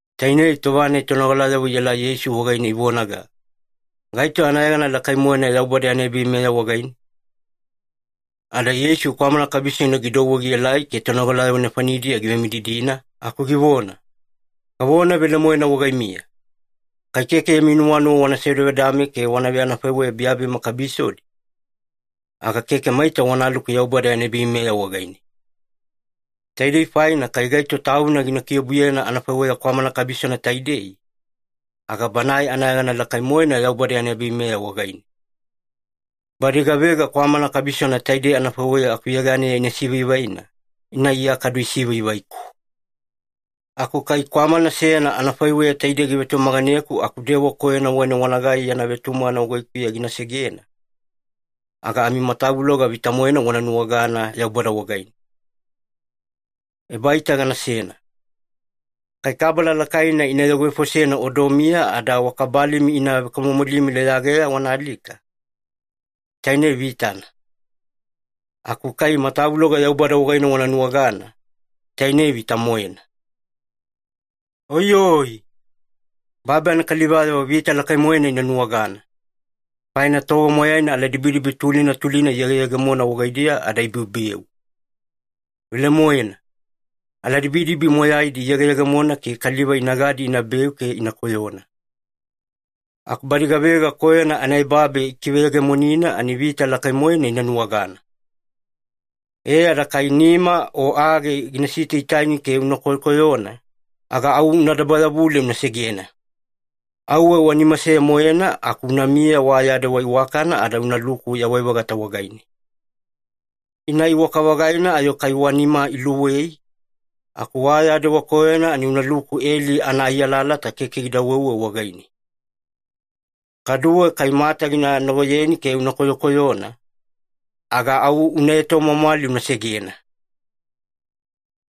Tainei tova-nai tonogalayavo ielai Yeisu wagaine ivonaga, “Gaito anayegana lakai-moena Yaubada yana ebaveimeya wagaine?” Ada Yeisu kwamana kabisona gidouwe gielai ke tonogalayavo nefanidiya givemididina aku givona, “Gavona velemoena wagaimiya, kai keke yami nuwanuwa wana sevedavedame ke wana veanafaiweya biyabiyama kabisodi, aga keke maita wanaluku Yaubada yana ebaveimeya wagaine. Taidei faina kai gaito tauna gina kiobuyena anafaiweya kwamana kabisona taidei, aga banae anayegana lakai-moena Yaubada yana ebaveimeya wagaine. Badi gavega kwamana kabisona taidei anafaiweya akuyeganeya ina sivaivaina, ina Iya kadu isivaivaiku. “Aku kai kwamana seyana anafaiweya taidei givetumaganeku aku dewa koyona wagaine wanagai yana vetumagana wagaikuya gina segena, aga amimatavuloga vita-moena wana nuwagana Yaubada wagaine. Ebaita ganasena. Kai kabala lakaina ina yogovefosena odomiya ada wa kabalimi ina vekamomolimi leyageya wana alika, tainei vitana. Aku kai matavuloga Yaubada wagaine wana nuwagana, tainei vita-moena. “Oiyoi! Babi anakalivayavo vita lakai-moena ina nuwagana, faina tova moyaina aladibidibi tulina tulina iyegeyegemona wagaidiya ada ibeubeu. Velemoena, ebaaladibidibi moyaidi iyegeyegemona ke kaliva inagadi inabeu ke ina koyona. Aku badi gavega koyona anaebabe ikiveyegemonina ani vita lakai-moena ina nuwagana. E ada kai nima o age gina sitaitaini ke una koyokoyona, aga au una dabayavule una segena. Auwe wa nima seya-moena aku unamiya wa ya dewa iwakana ada unaluku yawai-vagata wagaine. Ina iwaka-vagaina ayo kai wa nima iluwei, aku wa ya dewa koyona ani unaluku eli anaai alalata keke gida weuwe wagaine. Kaduwe kai mata gina nagoyeni ke una koyokoyona, aga au una etomwamwali una segena.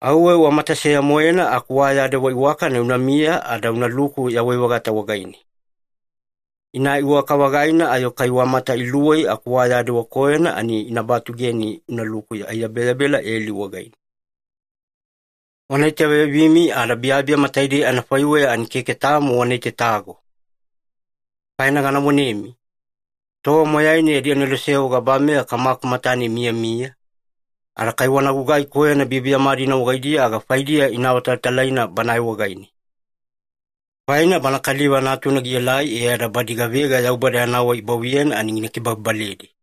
Auwe wa mata seya-moena aku wa ya dewa iwakana unamiya ada unaluku yawai-vagata wagaine. Ina iwaka-vagaina ayo kai wa mata iluwei aku wa ya dewa koyona ani ina batugeni unaluku aiyabeyabela eli wagaine. “Wana itaveyabimi ada biyabiyama taidei anafaiweya ani keke tamo wana itatago. Faina gana vonemi, tova moyaina yadi aneloseyavo gabameya Kamaku matane imiyamiya, ada kai wana gugai koyona biyabiyama-dina wagaidiya aga faidiya ina awatalatalaina Banae wagaine. Faina Bana Kaliva Natuna gielai e ada badi gavega Yaubada yana wai ibavuyena ani gina kibababaledi.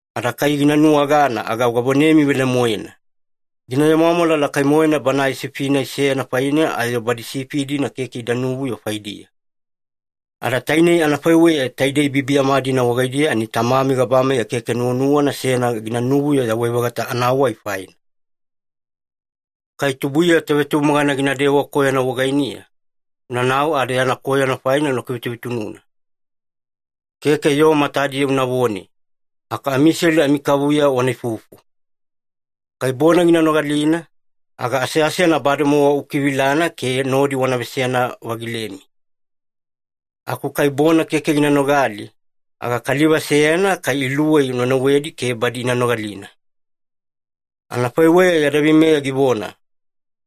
Ada kai gina nuwagana aga gavonemi velemoena, gina vemwamwala lakai-moena banae sifi-nai seyana faine ayo badi sifi-dina keke ida nuvuyo faidiya. Ada tainei anafaiweya, taidei biyabiyama-dina wagaidiya ani Tamami gabameya keke nuwanuwana seyana ginavuyo yawai-vagata anawai faina. “Kai tubuiya tovetumagana ginadewa koyona wagainiya, unanau ada yana koyona faina una kivetuvetununa. Keke yoo matadiya unavone, aku amiselu amikavuya wana ifufu. Kai bona gina nogalina, aga aseasena bademowa ukivilana ke nodi wana veseyana-vagilemi. Aku kai bona keke gina nogali, aga kaliva seyana kai iluwei una nauwedi ke badi ina nogalina. Anafaiweya adaveimeya givona,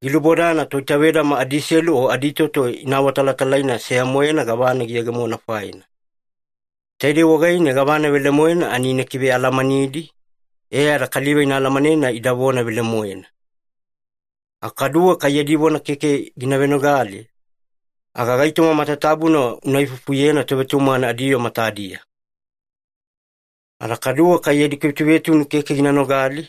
‘Gilubodana toitavedama adiselu o aditoto ina awatalatalaina seya-moena gavana giyegemona faina. Taidei wagaine gavana velemoena ani ina kivealamanidi, e ada kaliva ina alamanena ida vona velemoena.’ Aku kaduwe kai yadi vona keke gina venogale, aga gaitoma matatabuna una ifufuyena tovetumagana adiyoo matadiya. Ada kaduwe kai yadi kivetuvetunu keke gina nogali,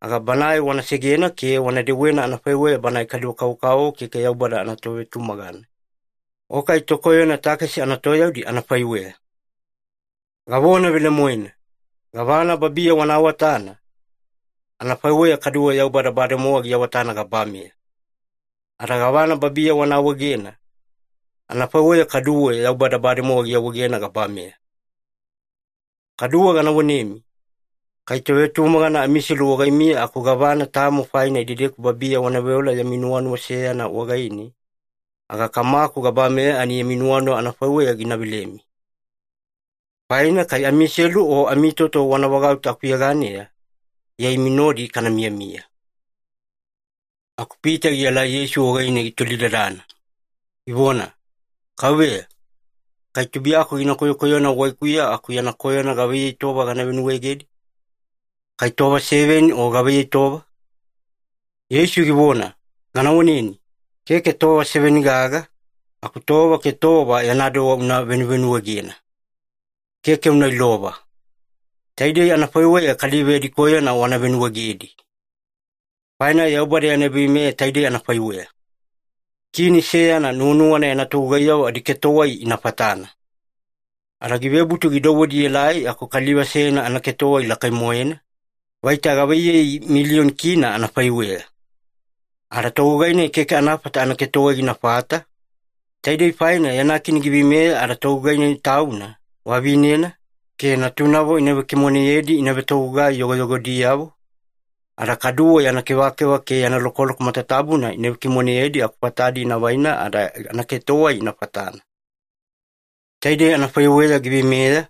aga banae wana segena ke wana dewena anafaiweya banae kaliva-kavokavovo keke Yaubada anatovetumagana, o kai tokoyona takesi anatoyaudi anafaiweya. Gavona velemoena, gavana babiya wana awatana, anafaiweya kaduwe Yaubada bademowa giawatana gabameya. Ada gavana babiya wana awaegena, anafaiweya kaduwe Yaubada bademowa giawaegena gabameya. Kaduwe gana vonemi, kai tovetumagana amiselu wagaimiya aku gavana tamo faina idedeku babiya wana veola yami nuwanuwa seyana wagaine, aga Kamaku gabameya ani yami nuwanuwa anafaiweya gina velemi. Faina kai amiselu o amitoto wana vagauta akuyeganeya, Iya imi nodi kana miyamiya.” Aku Pita gielai Yeisu wagaine gitolidadana, givona, “Kauveya, kai tubuiyaku gina koyokoyona wagaikuya aku yana koyona gavaiyei tova gana venuwaegedi? Kai tova seveni o gavaiyei tova?” Yeisu givona, “Gana voneni, keke tova seveni gaga, aku tova ke tova yana dewa una venuvenuwaegena. Keke una ilova. Taidei anafaiweya kaliva yadi koyona wana venuwaegedi. Faina Yaubada yana ebaveimeya taidei anafaiweya. Kini seyana nuwanuwana yana togugaiyavo adiketowai ina fatana. Ada givebutu gidouwedi ielai aku kaliva seyana anaketowai lakai-moena, vaita gavaiyei milioni kina anafaiweya. Ada togugai-nai keke anafata anaketowai ginafata, taidei faina yana kini giveimeya ada togugai-nai tauna, vavinena, ke natunavo ina vekimoneyedi ina vetogugai yogoyogodiyavo, ada kaduwe yana kevakeva ke yana lokoloko matatabuna ina vekimoneyedi aku fatadi ina vaina ada anaketowai ina fatana. Taidei anafaiweya giveimeya,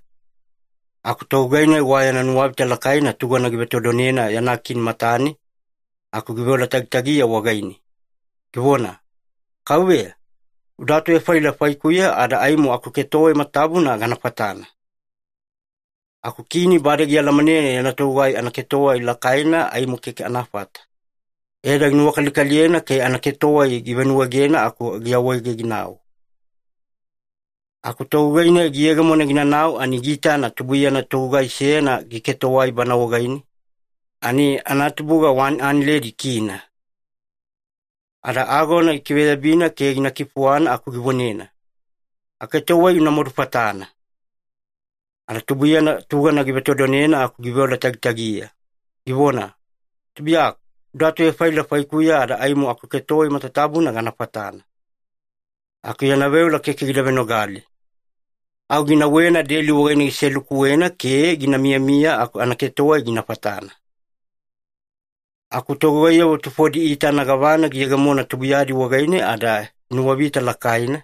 aku togugai-nai wa yana nuwavita lakaina tugana givetodonena yana kini matane, aku giveola tagitagiya wagaine, givona, ‘Kauveya, uda atuvefaila faikuya ada aimo akuketowai matatabuna gana fatana.’ Aku kini bade gialamanena yana togugai anaketowai lakaina aimo keke anafata, e ada ginuwakalikaliyena ke anaketowai givenuwaegena aku giawaege ginau. “Aku togugai-nai giyegemona ginanau ani giitana tubuiyana togugai seyana giketowai bana wagaine, ani anatubuga wani analedi kina (K100). Ada agona gikiveyabina ke gina kifuwana aku givonena, ‘Aketowai una madufatana!’ “Ada tubuiyana tugana givetodonena aku giveola tagitagiya, givona, ‘Tubuiyaku, uda atuvefaila faikuya ada aimo akuketowai matatabuna gana fatana.’ Aku yana veola keke gida venogale. Au ginauwena deli wagaine giselukuwena ke gina miyamiya aku anaketowai gina fatana. “Aku togugaiyavo tufodi iitana gavana giyegemona tubuiyadi wagaine ada inuwavita lakaina,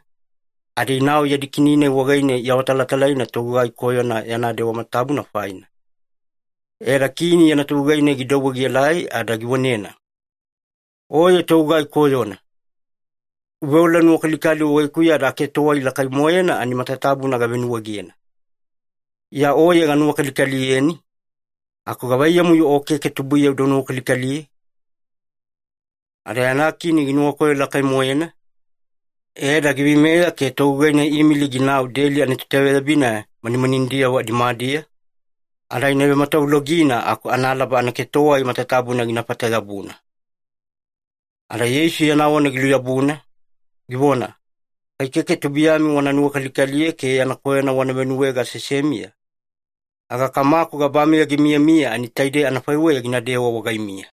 ada inau yadi kini-nai wagaine iawatalatalaina togugai koyona yana dewa matatabuna faina. E ada kini yana togugai-nai gidouwe gielai ada givonena, ‘Oye togugai koyona! Uveola-nuwakalikali wagaikuya ada aketowai lakai-moena ani matatabuna gavenuwaegena. Iya oye ganuwakalikaliyeni, aku gavaiyamu-yo o keke tubuiya uda nuwakalikaliye?’ Ada yana kini ginuwakoyo lakai-moena, e ada giveimeya ke togugai-nai iimili ginau deli anatoitaveyabina manimaninidiyavo nimadiya, ada ina vematavulogina aku analaba anaketowai matatabuna ginafata-yabuna.” Ada Yeisu yana vona giluyabuna, givona, “Kai keke tubuiyami wana nuwakalikaliye ke yana koyona wana venuwaege aseasemiya, aga Kamaku gabameya gimiyamiya ani taidei anafaiweya ginadewa wagaimiya.”